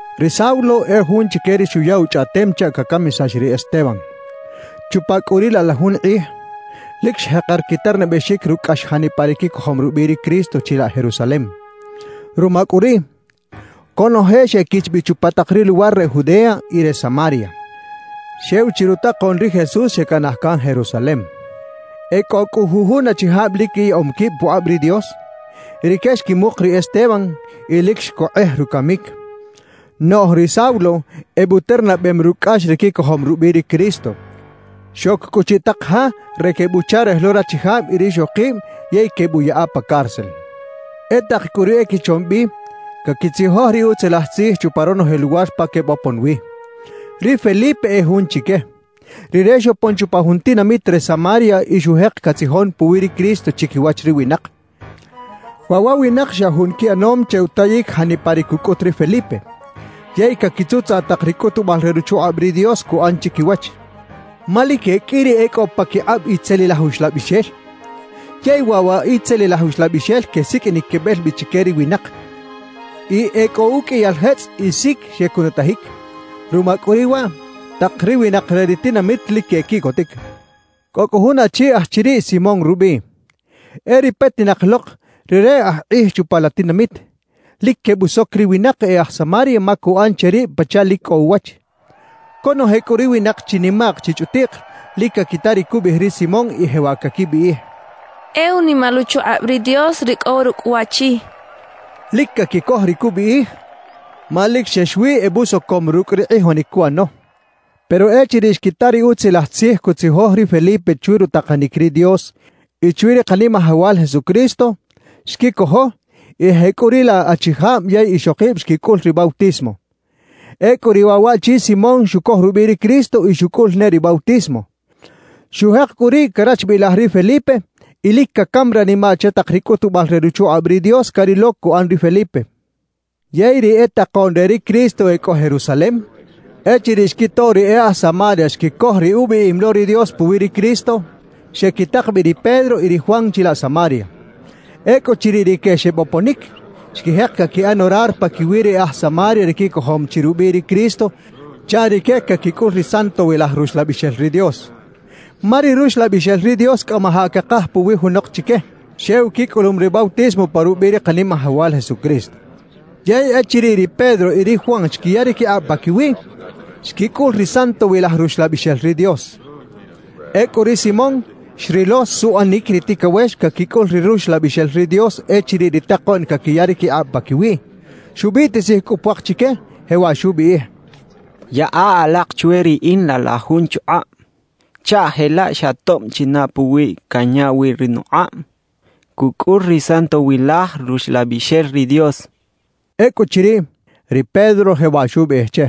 Ri Saulo e jun chique ri xuya uchꞌaꞌtem chaꞌ cacamisax ri Esteban. Chupa cꞌu riꞌ laꞌ la jun kꞌij, lic xjeker quiternabexic rucꞌ cꞌax janipa ri quicojom rubiꞌ ri Cristo chilaꞌ Jerusalem. Ruma cꞌu riꞌ, conoje xequich bi chupa tak ri luwar re Judea y re Samaria. Xew chi rutakoꞌn ri Jesús xecanaj can Jerusalem. E cꞌo cꞌu jujun achijab lic quiyaꞌom quib pukꞌab ri Dios; rique xquimuk ri Esteban y lic xcokꞌej rucamic. Noꞌj ri Saulo ebuternabem rucꞌ cꞌax ri quicojom rubiꞌ ri Cristo. Xoc cꞌu chiꞌ tak ja re quebuꞌcharej lo rachijab y rixokib yey quebuꞌyaꞌa pa cárcel. E tak cꞌu ri equichom bi caquitzijoj ri Utzilaj Tzij chupa ronoje luwar pa quebopon wi. Ri Felipe e jun chique. Rire xopon chupa jun tinamit re Samaria y xujek catzijon puwi ri Cristo chiquiwach ri winak. Waꞌ wa winak xa jun quiꞌanom che utayic janipa ri cucꞌut ri Felipe, yey caquitzutzaꞌ tak ri cꞌutubal re ruchukꞌab ri Dios cuꞌan chiquiwach. Ma lic e qꞌui ri e cꞌo paquikꞌab itzelilaj uxlabixel, yey waꞌ wa itzelilaj uxlabixel quesiqꞌuinic quebel bi chique ri winak. Y e cꞌo uqꞌuiyal jetzꞌ y sic xecunutajic. Ruma cꞌu riꞌ waꞌ, tak ri winak re ri tinamit lic quequiꞌcotic. Cꞌo cꞌu jun achi aj chiriꞌ Simón rubiꞌ. E ri petinak lok rire aj kꞌij chupa la tinamit; lic quebusoc ri winak e aj Samaria ma cuꞌan che rib pachaꞌ lic cꞌo uwach. Conoje cꞌu ri winak chinimaꞌk chichꞌutiꞌk, lic caquita ri cubiꞌij ri Simón y jewaꞌ caquibiꞌij: «E unimal uchukꞌab ri Dios ri cꞌo rucꞌ waꞌchi» quechaꞌ. Lic caquicoj ri cubiꞌij, ma lic xex wi ebusocom rucꞌ ri kꞌijonic cuꞌano. Pero echiriꞌ xquita ri Utzilaj Tzij cutzijoj ri Felipe chwi rutakanic ri Dios y chwi ri Kanimajawal Jesucristo, xquicojo y jecꞌuriꞌlaꞌ achijab yey ixokib xquicꞌul ri bautismo. Ecꞌu riꞌ waꞌchi Simón xucoj rubiꞌ ri Cristo y xucꞌul ne ri bautismo. Xujek cꞌu riꞌ carachbilaj ri Felipe y lic cacam ranimaꞌ che tak ri cꞌutubal re ruchukꞌab ri Dios carilo cuꞌan ri Felipe. Yey ri e takoꞌn re ri Cristo e cꞌo Jerusalem, echiriꞌ xquito ri e aj Samaria xquicoj ri ubiꞌim lo ri Dios puwi ri Cristo, xequitak bi ri Pedro y ri Juan chilaꞌ Samaria. Ecꞌuchiriꞌ rique xeboponic, xquijek caquiꞌan orar paquiwi ri aj Samaria ri quicojom chi rubiꞌ ri Cristo chaꞌ rique caquicꞌul ri Santowilaj Ruxlabixel ri Dios. Ma ri Ruxlabixel ri Dios cꞌamajaꞌ cakaj puwi junok chique, xew quicꞌulum ri bautismo pa rubiꞌ ri Kanimajawal Jesucristo. Yey echiriꞌ ri Pedro y ri Juan xquiya ri quikꞌab paquiwiꞌ, xquicꞌul ri Santowilaj Ruxlabixel ri Dios. Ecꞌu ri Simón xrilo suꞌanic ri ticawex caquicꞌul ri Ruxlabixel ri Dios echiriꞌ ri takoꞌn caquiya ri quikꞌab paquiwiꞌ. Xubiꞌtisij cꞌu puak chique, jewaꞌ xubiꞌij: —Yaꞌa alak chwe riꞌin laꞌ la jun chukꞌab, chaꞌ jelaꞌ xa tob china puwiꞌ canya wi ri nukꞌab, cucꞌul ri Santowilaj Ruxlabixel ri Dios —xchaꞌ. Ecꞌuchiriꞌ, ri Pedro jewaꞌ xubiꞌij che: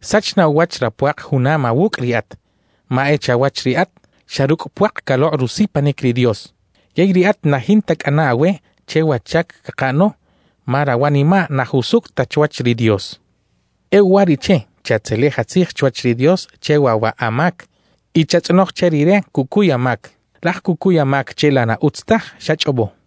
—Sach na uwach rapuak junam awucꞌ riꞌat, ma e chawach riꞌat, xa rucꞌ puak calokꞌ rusipanic ri Dios. Yey riꞌat na jinta cꞌana awe che wa chac cakaꞌano ma rawanimaꞌ na jusucꞌ ta chwach ri Dios. E uwariꞌche, chatzelej atzij chwach ri Dios che waꞌ wa amac y chatzꞌonoj che Rire cucuy amac. Laj cucuy amac che la na utz taj xachꞌobo.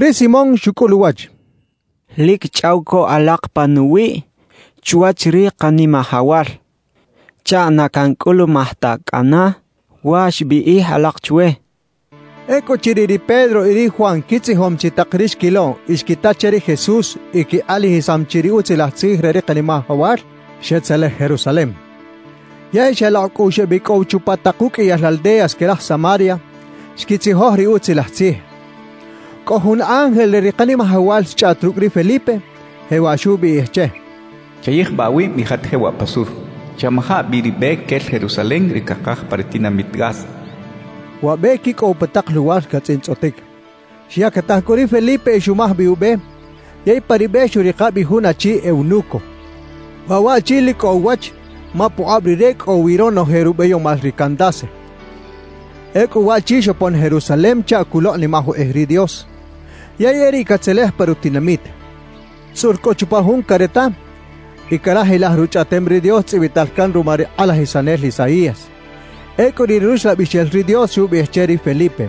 Ri Simón xucꞌul uwach: —Lic chꞌaw co alak panuwiꞌ chwach ri Kanimajawal chaꞌ na cancꞌulumaj ta cꞌana wa xbiꞌij alak chwe —xchaꞌ. Ecꞌuchiriꞌ ri Pedro y ri Juan quitzijom chi tak ri xquilo y xquita che ri Jesús y quikꞌalajisam chi ri Utzilaj Tzij re ri Kanimajawal, xetzelej Jerusalem. Yey xalokꞌ cꞌu xebicꞌow chupa tak uqꞌuiyal aldeas que raj Samaria, xquitzijoj ri Utzilaj Tzij. Cꞌo jun ángel re ri Kanimajawal xchꞌaꞌt rucꞌ ri Felipe, jewaꞌ xubiꞌij che: «Chayijbaꞌ awib y jat jewaꞌ pa sur. Chamaja bi ri be quel Jerusalem, ri cakaj pa ri tinamit Gaza» xchaꞌ. (Wa be quicꞌow pa tak luwar catzꞌintzꞌotic.) Xyactaj cꞌu ri Felipe y xumaj bi ube yey pa ri be xuꞌrika bi jun achi “eunuco”. Waꞌ waꞌchi lic cꞌo uwach ma pukꞌab rire cꞌo wi ronoje rubeyomal ri Candace. Ecꞌu waꞌchi xopon Jerusalem chaꞌ culokꞌnimaj ukꞌij ri Dios, yey e riꞌ catzelej pa rutinamit. Tzꞌul cꞌu chupa jun careta y carajilaj Ruchꞌaꞌtem ri Dios tzꞌibital can ruma ri kꞌalajisanel Isaías. Ecꞌu ri Ruxlabixel ri Dios xubiꞌij che ri Felipe: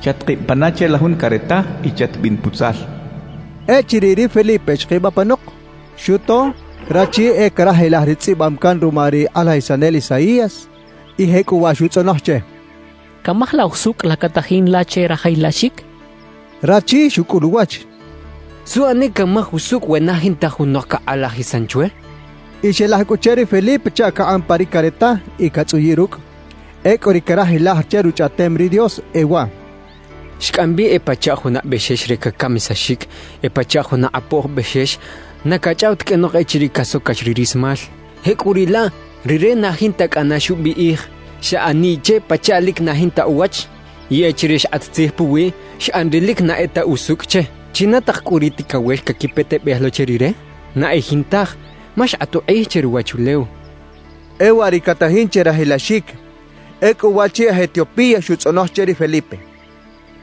«Chatkib pana che la jun careta y chatbin putzal» xchaꞌ. Echiriꞌ ri Felipe xkib apanok, xuto rachi e carajilaj ri tzꞌibam can ruma ri kꞌalajisanel Isaías y jecꞌuwaꞌ xutzꞌonoj che: —¿Camaj la usucꞌ la catajin la che rajilaxic? —xcha che. Rachi xucꞌul uwach: —¿Suꞌanic canmaj usucꞌ we na jinta junok cakꞌalajisan chwe? —xcha che. Y xelaj cꞌu che ri Felipe chaꞌ cakꞌan pa ri careta y catzꞌuyiꞌ rucꞌ. Ecꞌu ri carajilaj che Ruchꞌaꞌtem ri Dios e waꞌ: Xcꞌam bi e pachaꞌ juna bexex re cacamisaxic; e pachaꞌ juna kꞌapoj bexex na cachꞌaw ta qꞌuenok echiriꞌ casocax ri rismal; jecꞌuriꞌlaꞌ rire na jinta cꞌana xubiꞌij. Xꞌaniꞌ che pachaꞌ lic na jinta uwach; y echiriꞌ xkꞌat tzij puwiꞌ, xꞌan ri lic na e ta usucꞌ che. ¿China tak cꞌu ri ticawex caquipetebej lo che rire? Na e jintaj, ma xkꞌat ukꞌij che ruwachulew. E waꞌ ri catajin che rajilaxic. Ecꞌu waꞌchi aj Etiopía xutzꞌonoj che ri Felipe: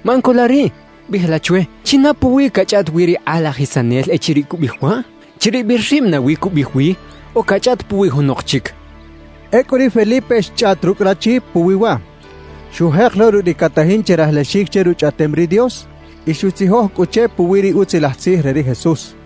—Maꞌan co la riꞌ biꞌij la chwe, ¿china puwi cachꞌaꞌt wi ri kꞌalajisanel echiriꞌ cubiꞌij waꞌ? ¿Chiribil rib nawi cubiꞌij wi o cachꞌaꞌt puwi junok chic? —xchaꞌ. Ecꞌu ri Felipe xchꞌaꞌt rucꞌ rachi puwi waꞌ. Xujek lo rucꞌ ri catajin che rajilaxic che Ruchꞌaꞌtem ri Dios y xutzijoj cꞌu che puwi ri Utzilaj Tzij re ri Jesús.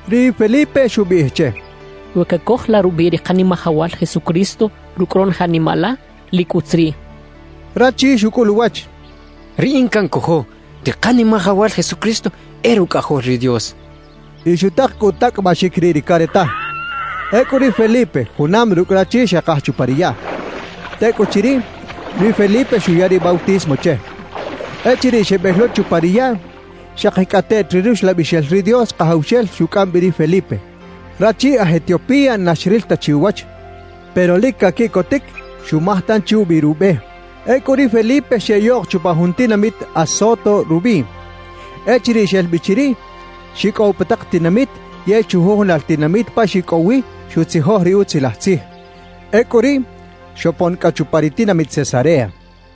Ri Felipe xubiꞌij che: —We cacoj la rubiꞌ ri Kanimajawal Jesucristo rucꞌ ronoje animaꞌ la, lic utz riꞌ —xcha che. Rachi xucꞌul uwach: —Riꞌin cancojo ri Kanimajawal Jesucristo e Rucꞌajol ri Dios —xchaꞌ. Y xutak cꞌu utacꞌabaxic riꞌ ri careta. Ecꞌu ri Felipe junam rucꞌ rachi xekaj chupa ri yaꞌ. Tecꞌuchiriꞌ, ri Felipe xuya ri bautismo che. Echiriꞌ xebel lo chupa ri yaꞌ, xakicꞌateꞌt ri Ruxlabixel ri Dios Kajawxel xucꞌam bi ri Felipe. Rachi aj Etiopía na xril ta chi uwach, pero lic caquiꞌcotic xumaj tanchi ubi rube. Ecꞌu ri Felipe xeꞌyoꞌk chupa jun tinamit Azoto rubiꞌ. Echiriꞌ xel bi chiriꞌ, xicꞌow pa tak tinamit yey chujujunal tinamit pa xicꞌow wi, xutzijoj ri Utzilaj Tzij. Ecꞌu riꞌ xopon cꞌa chupa ri tinamit Cesarea.